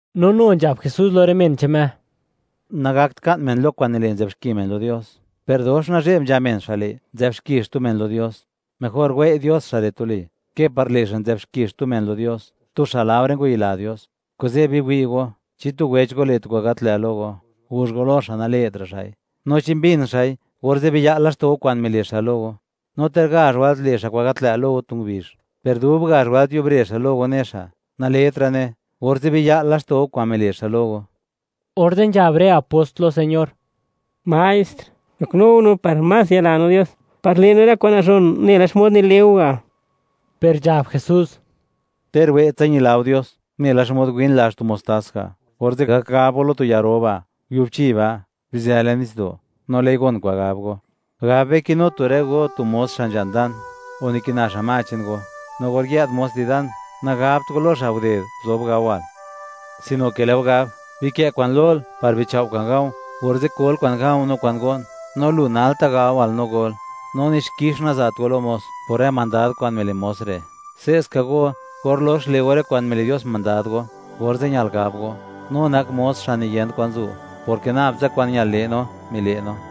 No nu nzhab Jesús lo rë men che'n Me: ―Nagakt ka'n men lo kwa'n nile' nzë'b xki men lo Dios, per dox nazhe'b nzha men xa' le', nzë'b xki xtu men lo Dios. Mejor wei' Dios xa' re' tuli, ke par le' xa', nzë'b xki xtu men lo Dios, tu xa' laore ngwayila Dios. Kuze', biwi' go, chi tu wech go le' tu kwa'n gat lë' lo go, guzh go lo xa' nale'tra' xa'i; no chi mbin xa'i, orze' biya'l laxto' go kwa'n mile' xa' lo go. No ter gazh wëlt le' xa' kwa'n gat lë' lo go tu ngubizh, per dub gazh wëlt yubre xa' lo go ne xa': “Nale'tra'ne”, orze' biya'l laxto' go kwa'n mile' xa' lo go. Orze' nzhab rë apost lo Señor: ―Maestr, goknu go no par más yila no Dios, par le' no rë kwa'n nazhon nela xmod nile' go ga'. Per nzhab Jesús: ―Ter we'tsa ñila go Dios, nela xmod win lazh tu mostás ga', orze' gak gab go lo tu ya ro ba': “Yubchi ba', bizë le'n nitsdo'”, no lë'i gon kwa'n gab go. ’Gab be, kinu tu rë go tu mos xa' nzha'n dan, o nikina xa' ma che'n go; no or yë'd mos di dan, nagabt go lo xa': “Guded, guzob gawal”, sino ke lë' go gab: “Bikë' kwa'n lol, par bichao' kwa'n ga̱u̱, orze' kol kwa'n ga̱u̱ no kwa'n go'n; no lu nalta' gawal no gol.” No ni xkix naza't go lo mos, por rë mandad kwa'n mile' mos re'. Se'ska go, or lox le' go rë kwa'n mile' Dios mandad go, orze' ñal gab go: “No nak mos xa' niyent kwan zu', porke nab tsa kwa'n ñal le' no, mile' no.”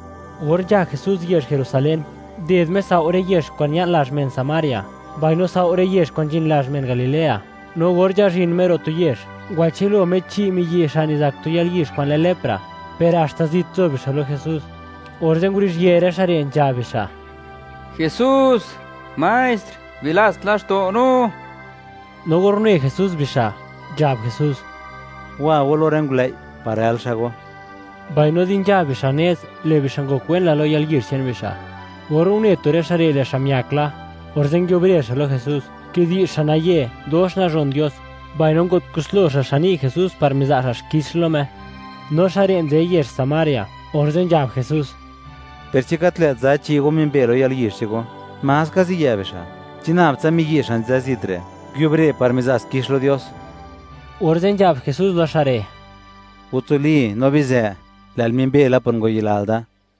Or nzha Jesús yezh Jerusalén, nded Me sao' rë yezh kwa'n ña'n lazh men Samaria, mbaino sao' rë yezh kwa'n nzhin lazh men Galilea. No or nzhazhin Me ro' tu yezh, ngwachë'l lo Me chi' miyi' xa' nizak tu yalyizh kwa'n lë lepra, per haxta zit nzo bixa' lo Jesús, orze' nguruzhië rë xa' re', nzhab bixa': ―¡Jesús, Maestr, bilats laxto' go no! No or une Jesús bixa', nzhab Jesús: ―Wa go lo rë ngulëi', par rël xa' go. Mbaino di nzha bixa' nez, lë' bixa' ngokwen la lo yalyizh che'n bixa'. Or une tu rë xa' re', lë' xa' miak la; orze' nguiubre xa' lo Jesús, kidi'zh xa' naye, dox nazhon Dios, mbaino ngo't kuslo xa' xan ni' Jesús par miza' xa' xkix lo Me; no xa' re' nzë yezh Samaria. Orze' nzhab Jesús: ―Per, ¿chi gat lë't za chi' go mimbe lo yalyizh che'n go? ¿Ma ska zi yë' bixa'? ¿Chi nab tsa miyi' xa' nzë zit re', nguiubre par miza' xkix lo Dios? Orze' nzhab Jesús lo xa' re': ―Watsoli no bizë; lë'l mimbe la por ngwayilal da.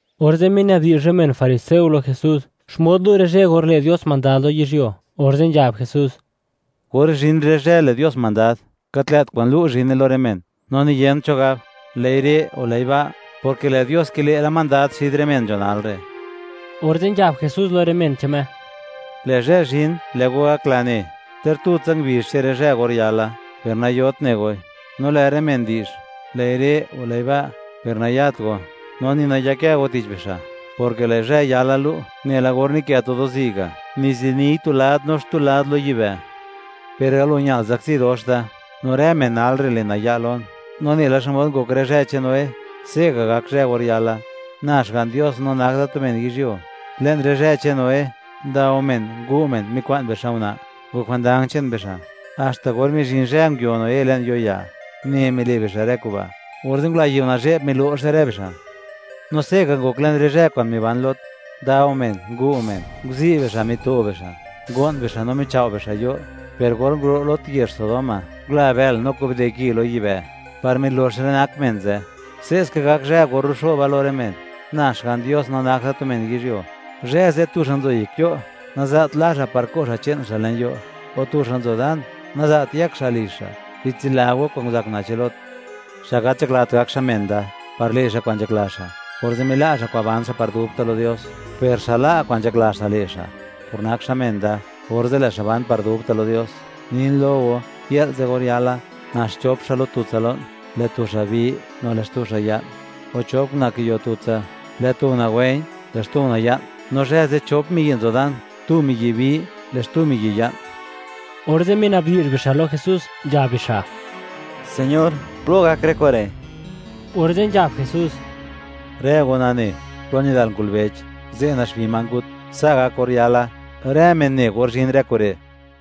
Orze' minabdi'zh rë men fariseo lo Jesús, xmod lu' rë zhë, or le' Dios mandad lo yizhyuo; orze' nzhab Jesús: ―Or zhin rë zhë le' Dios mandad, gat lë't kwa'n lu' zhine lo rë men, no ni yent cho gab: “Lë'i re'”, o “Lë'i ba'”, porke lë' Dios kile' la mandad xid rë men nzho nal re'. Orze' nzhab Jesús lo rë men che'n Me: ―Lë' zhë zhin, lë' go gakla ne, ter tutsa ngubizh che'n rë zhë or yala, per nayot ne goi. ’No lë' rë men di'zh: “Lë'i re'”, o “Lë'i ba'”, per nayat go, no ni nayakë go tich bixa', porke lë' zhë yala lu', nela or nikë tu do'zi' ga', niziniy tu lad no xtu lad lo yibë'. Per galo ñal, zakzi dox da, no rë men nal re' le' naya' lon. No nela xmod ngok rë zhë che'n Noé, se'ga' gak zhë or yala, na Xga'n Dios no nak da tu men yizhyuo. ’Le'n rë zhë che'n Noé, ndao men ngu' men, mikwa'n bixa' una', ngok jwandang che'n bixa'; haxta or mizhin zhë nguio Noé le'n yo'ya, une mile' bixa' rë kuba', orze' ngula yiu nazhe'b milo'xe rë bixa'. No se'ga' ngok le'n rë zhë kwa'n miban Lot; ndao men ngu' men, nguzi' bixa' mito bixa', ngo'n bixa', no michao' bixa' yo'. Per or nguro' Lot yezh Sodoma, ngula bël no kubde ki lo yibë', par milox rë nak men ze'. Se'ska gak zhë or ruxoba lo rë men, na Xga'n Dios no nak da tu men yizhyuo. ’Zhë ze', tu xa' nzo yek yo' naza't la xa' par ko' xa' che'n xa' le'n yo'; o tu xa' nzo dan, naza't yëk xa' lizh xa'. Bitsila go kwa'n nguzak una' che'n Lot. Xa' gat nzhaklat gak xa' men da, par le' xa' kwa'n nzhakla xa', orze' mila' xa' kwa'n ban xa' par dubta' lo Dios; per xa' la' kwa'n nzhakla xa' le' xa' por nak xa' men da, orze' lë' xa' ban par dubta' lo Dios. ’Nin lo go, yë'l ze' or yala, nax chop xa' lo tutsa lo'n, lë' tu xa' bi, no lë' xtu xa' ya'n. O chop una' kiyo tutsa; lë' tu una' wë̱i̱, lë' xtu una' ya'n. No zhë ze', chop miyi' nzo dan; tu miyi' bi, lë' xtu miyi' ya'n. Orze' minabdi'zh bixa' lo Jesús, nzhab bixa': ―Señor, ¿plo gak rë kure'? Orze' nzhab Jesús: ―Rë go nane, plo nidal ngulbech, ze' naxbi ma ngut. Sa' gak or yala: Rë men ne or zhin rë kure'.